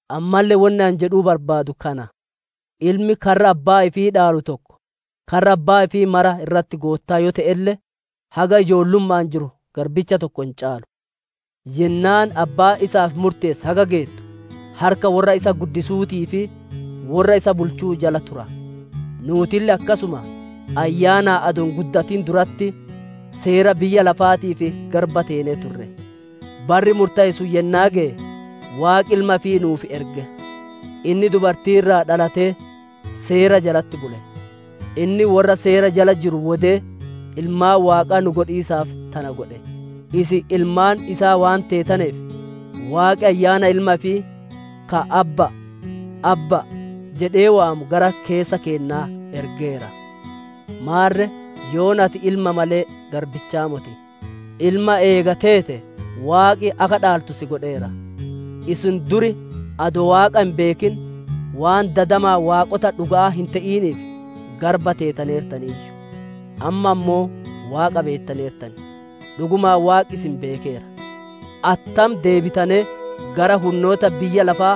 Ammalle wonni ani jedhuu barbaadu kana: ilmi karra abbaa ifii dhaalu tokko, karra abbaa ifii mara irratti goottaa yoo te'elle, haga ijoollumma'aan jiru garbicha tokko hin caalu. Yennaan abbaan isaaf murteesse haga geettu, harka worra isa guddisuutii fi worra isa bulchuu jala tura. Nuutille akkasuma, ayyaanaan adoo hin guddatin duratti, seera biyya lafaatiif garba teenee turre. Barri murtaye sun yennaa geye, Waaqi Ilma ifii nuuf erge. Inni dubartii irraa dhalatee, Seera jalatti bule. Inni worra Seera jala jiru wodee, ilmaan Waaqaa nu godhiisaaf tana godhe. Isin ilmaan isaa waan teetaneef, Waaqi Ayyaana Ilma ifii ka, «Abbaa, Abbaa» jedhee waamu gara keessa keennaa ergeera. Maarre yoona, ati ilma malee garbichaa moti; ilma eega teete, Waaqi akka dhaaltu si godheera. Isin dur adoo Waaqa hin beekin, waan dadamaan waaqota dhuga'aa hin te'iniif garba teetaneertaniiyyu. Amma ammoo Waaqa beettaneertan; dhugumaan Waaqi isin beekeera. Attam deebitanee gara hunnoota biyya lafaa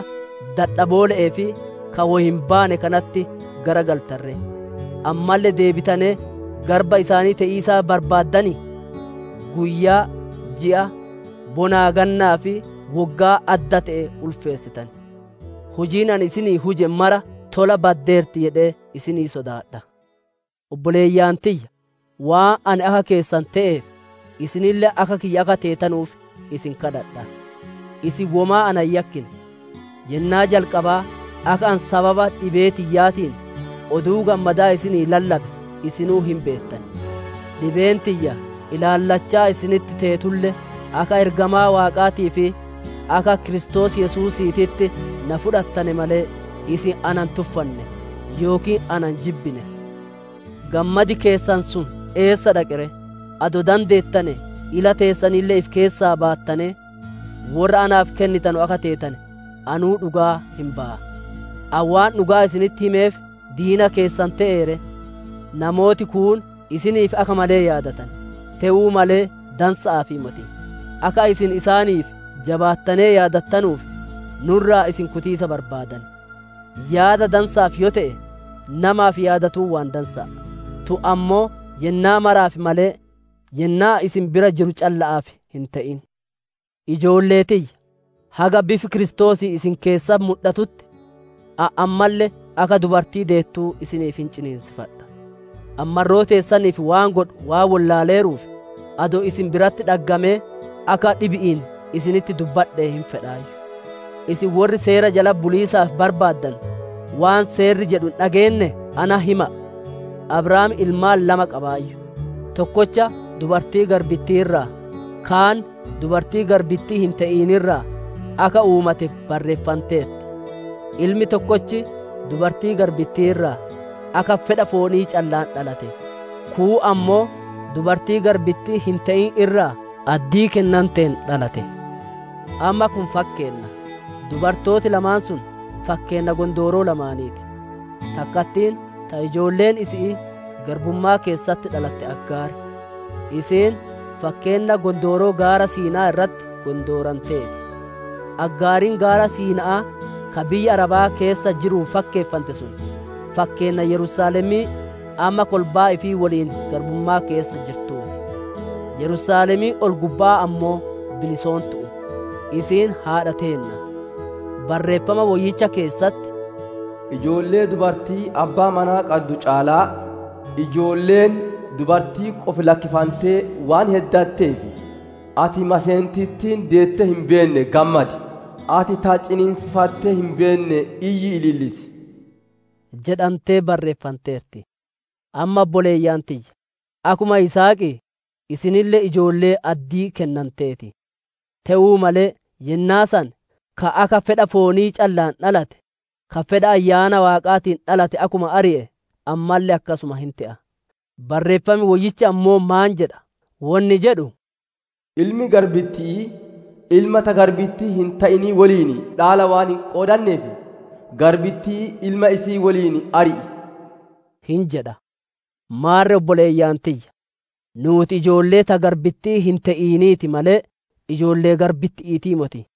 dadhaboole'ee fi ka woy hin baane kanatti garagaltan ree? Ammalle deebitanee garba isaanii te'iisaaf barbaaddan? Guyyaa, ji'a, bonaa-gannaa fi woggaa adda te'e ulfeessitan. Hujiin ani isinii huje mara tola baddeerti jedhee isinii sodaadha. Obboleeyyan tiyya, waan ani akka keessan te'eef, isinille akka kiyya akka teetanuuf isin kadhadha. Isin womaa na hin yakkine. Yennaa jalqabaa, akka ani sababa dhibee tiyyaatiin, Oduu Gammadaa isinii lallabe, isinuu hin beettan. Dhibeen tiyya ilaallachaa isinitti teetulle, akka ergamaa Waaqaatii fi akka Kiristoos Yesuusiititti na fudhattane malee, isin na hin tuffanne, yookiin na hin jibbine. Gammad keessan sun eessa dhaqe ree? Adoo dandeettane ila teessanille ifi keessaa baattanee, worra naaf kennitanu akka teetane anuu dhugaa hin baya. Ani waan dhugaa isinitti himeef diina keessan te'ee ree? Namooti kuun isiniif akka malee yaadatan, te'uu malee dansa'aafii moti; akka isin isaaniif jabaattanee yaadattanuuf, nu irraa isin kutiisa barbaadan. Yaada dansa'aaf yoo te'e, namaaf yaadatuun waan dansa'a; tun ammoo yennaa maraaf malee, yennaa ani isin bira jiru calla'aaf hin te'in. Ijoollee tiyya, haga bifi Kiristoosii isin keessatti mudhatutti, ani ammalle akka dubartii deettuu isiniif hin ciniinsifadha. Ani marroo teessaniif waan godhu waan wollaaleeruuf, adoo isin biratti dhaggamee akka dhibi'iin isinitti dubbadhee hin fedhaayyu. Isin worri Seera jalatti buliisaaf barbaadanu, waan Seerri jedhu hin dhageennee? Natti hima'a! Abrahaam ilmaan lama qabaayyu; tokkocha dubartii garbittii irraa, kaan dubartii garbittii hin te'in irraa, akka uumate barreeffanteerti. Ilmi tokkochi dubartii garbittii irraa, akka fedha foonii calla'aan dhalate; kuun ammoo dubartii garbittii hin te'in irraa, addii kennanteen dhalata. Amma kun fakkeenna; dubartooti lamaan sun fakkeenna gondooroo lamaanii ti. Takkattiin ta ijoolleen isi'ii garbummaa keessatti dhalatte Aggaari; isiin fakkeenna gondooroo Gaara Siina'aa irratti gondoorantee ti. Aggaariin Gaara Siina'aa ka biyya Arabaa keessa jiruun fakkeeffante sun, fakkeenna Yerusaalemii amma kolbaa ifii woliin garbummaa keessa jirtuu ti. Yerusaalemiin ol-gubba'aa ammoo bilisoontu'u; isiin haadha teenna. Barreeffama Woyyicha keessatti, «Ijoollee dubartii abbaa manaa qadduu caalaa, ijoolleen dubartii qofi lakkifantee waan heddatteef, ati maseentittiin deettee hin beenne gammadi; ati ta ciniinsifattee hin beenne iyyii ilillisi!» jedhantee barreeffanteerti. Amma obboleeyyan tiyya, akkuma Yisihaqii, isinille ijoollee addii kennantee ti. Te'uu malee, yennaa san ka akka fedha foonii calla'aan dhalate, ka fedha Ayyaana Waaqaatiin dhalate akkuma ari'e, ammalle akkasuma hin te'a. Barreeffami Woyyichi ammoo maan jedha? Wonni jedhu, «Ilmi garbitti'ii, ilma ta garbittii hin te'inii woliin dhaala waan hin qoodanneef, garbittii ilma isi'ii woliin ari'i!» hin jedha. Maarre obboleeyyan tiyya, nuuti ijoollee ta garbittii hin te'inii ti malee, ijoollee garbitti'iitii moti.